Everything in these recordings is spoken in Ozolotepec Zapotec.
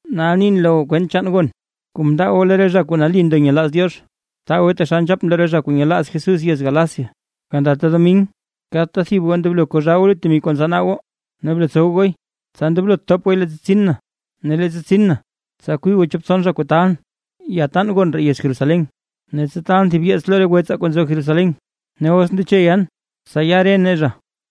Nal nin lo goo kwent chaan gon kuu mndaa goo lo re zha kuu nali ndo nyelaaz Diox, btaa gooy taxal nzhapʼn lo re zha kuu nyelaaz Jesús yez Galacia. Gandata domin, kadta thib goo ndoblo kozhaa goo lut temi lo kuu ntsanaa goo, ne blotsow gooy, tsa ndoblot thop gooy leettsa tsin na. Ne leettsa tsin na, tsa kwii goo chop tson zha kuu taalʼn yataan gon ree yez Jerusalén, ne tsa taalʼn thib yeets lo re wetsaa kuu nzo Jerusalén. Ne os ndeche yan, tsa ya re nee zha.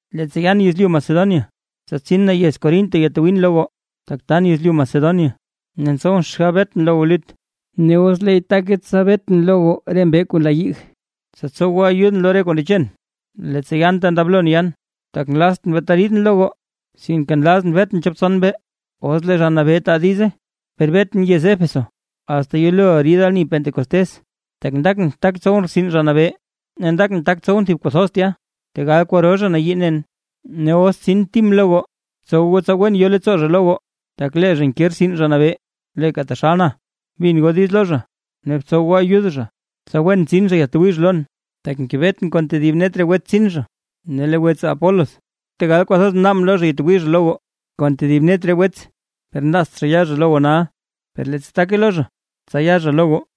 Leettsa yan yezlyu Macedonia, tsa tsin na yez Corinto yatwiin lo goo, tak tan yezlyu Macedonia. Ne ntsowʼn xgab betʼn lo goo lut, ne os leey take tsa betʼn lo goo re mbee kuu nla yig, tsa tsow goo ayudʼn lo re kuu ndechen, leettsa yan ta ndoblo yan. Tak nlaztʼn beeta riidʼn lo goo, sinke nlazʼn betʼn chop tson mbee, os lee Zha Nabee taa diize. Per betʼn yez Éfeso, asta yelo rid ani Pentecostés, tak ndakʼn tak tsowʼn rtsin Zha Nabee, ne ndakʼn tak tsowʼn thib kuu thoz tya, tegal kwaro zha nayii nen. Ne os tsin Tim lo goo, btsow goo tsa wen yo leettsoo zha lo goo, tak lee zha nke rtsin Zha Nabee, leeka taxal na. Bin goo diiz lo zha; ne btsow goo ayud zha, tsa wen tsin zha yaadtwii zha lon, tak ngebetʼn kon tedib net re wetsaa tsin zha. Ne lee wetsaa Apolos, tegal kwathoz mnaabʼn lo zha yatwii zha lo goo kon tedib net re wets, per nlaazt zha ya zha lo goo nal, per leettsa take lo zha, tsa ya zha lo goo.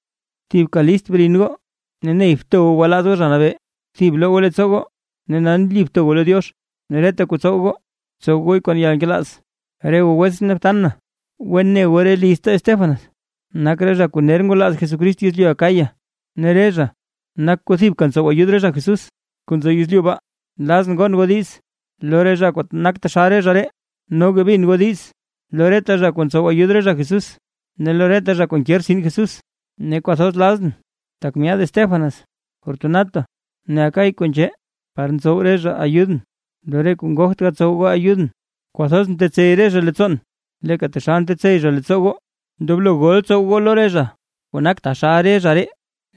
Thibka list brin goo ne ney bto goo gwalaaz goo Zha Nabee. Thib bloo goo leettsoo goo ne nali bto goo lo Diox. Ne reta kuu tsow goo, btsow gooy kon yalnkelaaz. Re goo wetsʼn ne btan na, wen ne goo re lizta Estéfanas nak re zha kuu ner ngwalaaz Jesucrist yezlyu Acaya, ne re zha nak kuu thibka ntsow ayud re zha Jesús kuu nzo yezlyu baa. Nlazʼn gon goo diiz lo re zha kuu nak taxal re zha ree, noga bin goo diiz lo reta zha kuu ntsow ayud re zha Jesús ne lo reta zha kuu nke rtsin Jesús. Ne kwathoz lazʼn tak myaad Estéfanas, Fortunato ne Acaico nzhee, par mtsow re zha ayudʼn lo re kuu ngogt gatsow goo ayudʼn. Kwathoz mtetsey re zha leettsoon, leeka taxal ntetsey zha leettsoo goo. Ndoblo gol tsow goo lo re zha kuu nak taxal re zha ree.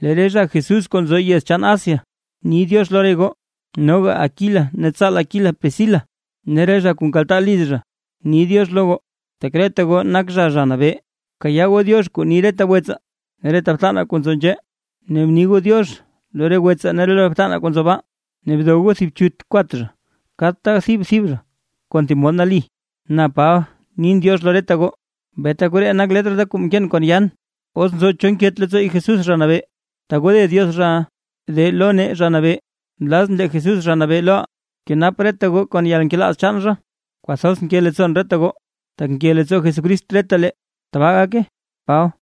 Lee re zha Jesús kuu nzo re yez chaan Asia ni “diox” lo re goo. Noga Aquila ne tsaal Aquila Priscila, ne re zha kuu nkaltaa liz zha, ni “diox” lo goo, tak reta goo nak zha Zha Nabee. Bkayaa goo “diox” kuu ni reta wetsaa ne reta btanaa kuu nzo nzhee, ne bni goo “diox” lo re wetsaa ne lo re btanaa kuu nzo baa, ne dow goo thib chut kwat kadta thib thib zha thib mod nali. Na Paba nin “diox” lo reta goo, beeta koree nak letr da kuu mkeen kon yaan. Os nzo cho nket leettsoo Jesús Zha Nabee, tagode Diox zhaʼa. ¡De lo nee, Zha Nabee! Nlazʼn lee Jesús Zha Nabee loʼaa, kenap reta goo kon yalnkelaaz chaan zha. Kwathoz nke leettsoon reta goo, tak nke leettsoo Jesucrist retalee. ¡Tbaa gake! Paba